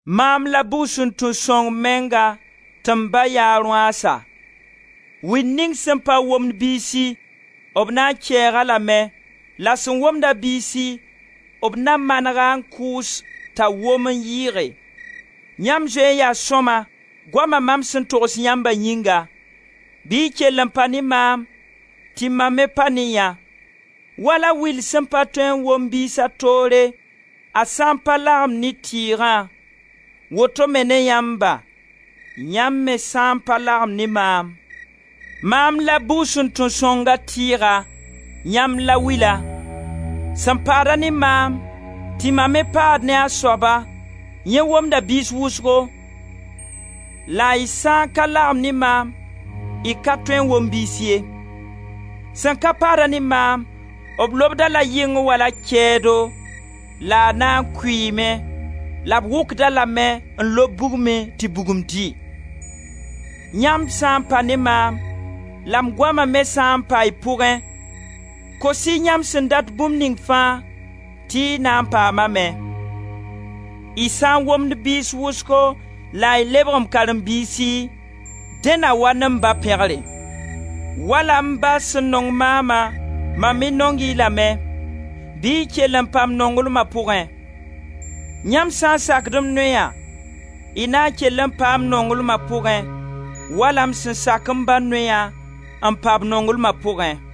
Maam la bugsuntun-sõng menga tɩ m Ba yaa a rõaasa. Will ning sẽn pa womd biisi, b na n kɛɛg-a lame, la sẽn womd-a biisi b na maneg-a n kʋʋs t'a wom n yɩɩge. Yãmb zoe n yaa sõma, goama mam sẽn togs yãmba yĩnga. Bɩ y kell n pa ne maam, tɩ mam me pa ne yã. Wala will sẽn pa tõe n wom biisa toore, a sã n pa lagem ne tɩɩgã, woto me ne yãmba, yãmb me sã n pa lagem ne maam. Maam la bugsuntun-sõngã tɩɩga, yãmb la wila. Sẽn paad-a ne maam, tɩ mam me paad ne a soaba, yẽ womda biis wʋsgo, la y sã n ka lagem ne maam, y ka tõe n wom biis ye. Sẽn ka paad-a ne maam, b lobd-a la yɩng wala, kɛɛdo la a na n kʋɩɩme, la b wʋkd-a lame n lob bugmẽ tɩ bugum dɩ. Yãmb sã n pa ne maam, la m goama me sã n pa y pʋgẽ, kos-y yãmb sẽn dat bũmb ning fãa, tɩ y na n paamame. Y sã n womd biis wʋsgo la y lebg m karen-biisi, dẽ na wa ne m Ba pẽgre. Wala m Ba sẽn nong maama, mam me nong-y lame. Bɩ y kell n pa m nonglma pʋgẽ. Yãmb sã n sakd m noya, y na n kell n paa m nonglma pʋgẽ, wala m sẽn sak m Ba noya n paa b nonglma pʋgẽ.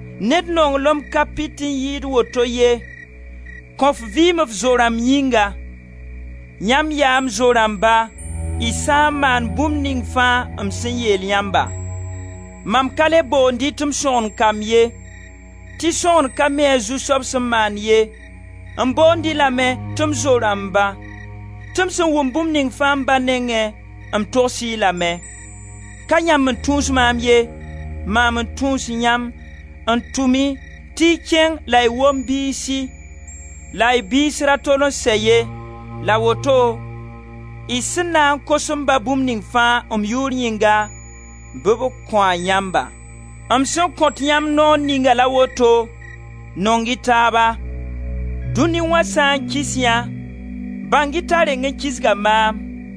Ned nonglem ka pit n yɩɩg woto ye: kõ f vɩɩm f zo-rãmb yĩnga. Yãmb yaa m zo-rãmba, y sã n maan bũmb ning fãa m sẽn yeel yãmbã. Mam ka le boond-y tɩ m sõgen-kamb ye, tɩ sõgen ka mi a zu-soab sẽn maand ye; m boond-y lame tɩ m zo-rãmba, tɩ m sẽn wʋm bũmb ning fãa m Ba nengẽ, m togs-y lame. Ka yãmb n tũus maam ye, maam n tũus yãmb, n tʋm-y tɩ y kẽng la y wom biisi la y biis ra tol n sɛ ye la woto y sẽn na n kos m Ba bũmb ning fãa, m yʋʋr yĩnga, bɩ b kõ-a yãmba. M sẽn kõt yãmb noor ninga la woto: nong-y taaba. Dũni wã sã n kis yã, bãng-y t'a reng n kisga maam.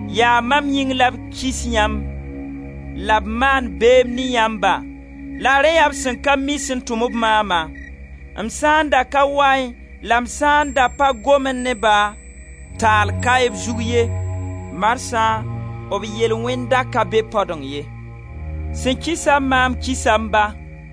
Yaa mam yĩng la b kis yãmb la b maand beem ne yãmba, la rẽ yaa b sẽn ka mi sẽn tʋm-b maama. M sã n da ka waẽ la m sã n da pa gomẽ ne-ba, taal kaẽ b zug ye, marsã b yel-wẽnda ka be padõng ye. Sẽn kisa maam kisa m Ba.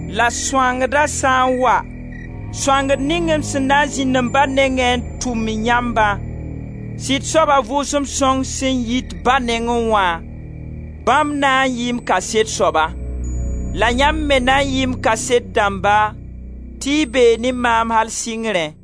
La Sõangda sã n wa, Sõangd ning m sẽn na n zĩnd m Ba nengẽ n tʋm yãmbã, Sɩd soab a Vʋʋsem Sõng sẽn yit Ba nengẽ wã, bãmb na n yɩɩ m kaset soaba. La yãmb me na n yɩɩ m kaset dãmba, tɩ y bee ne maam al sɩngrẽ.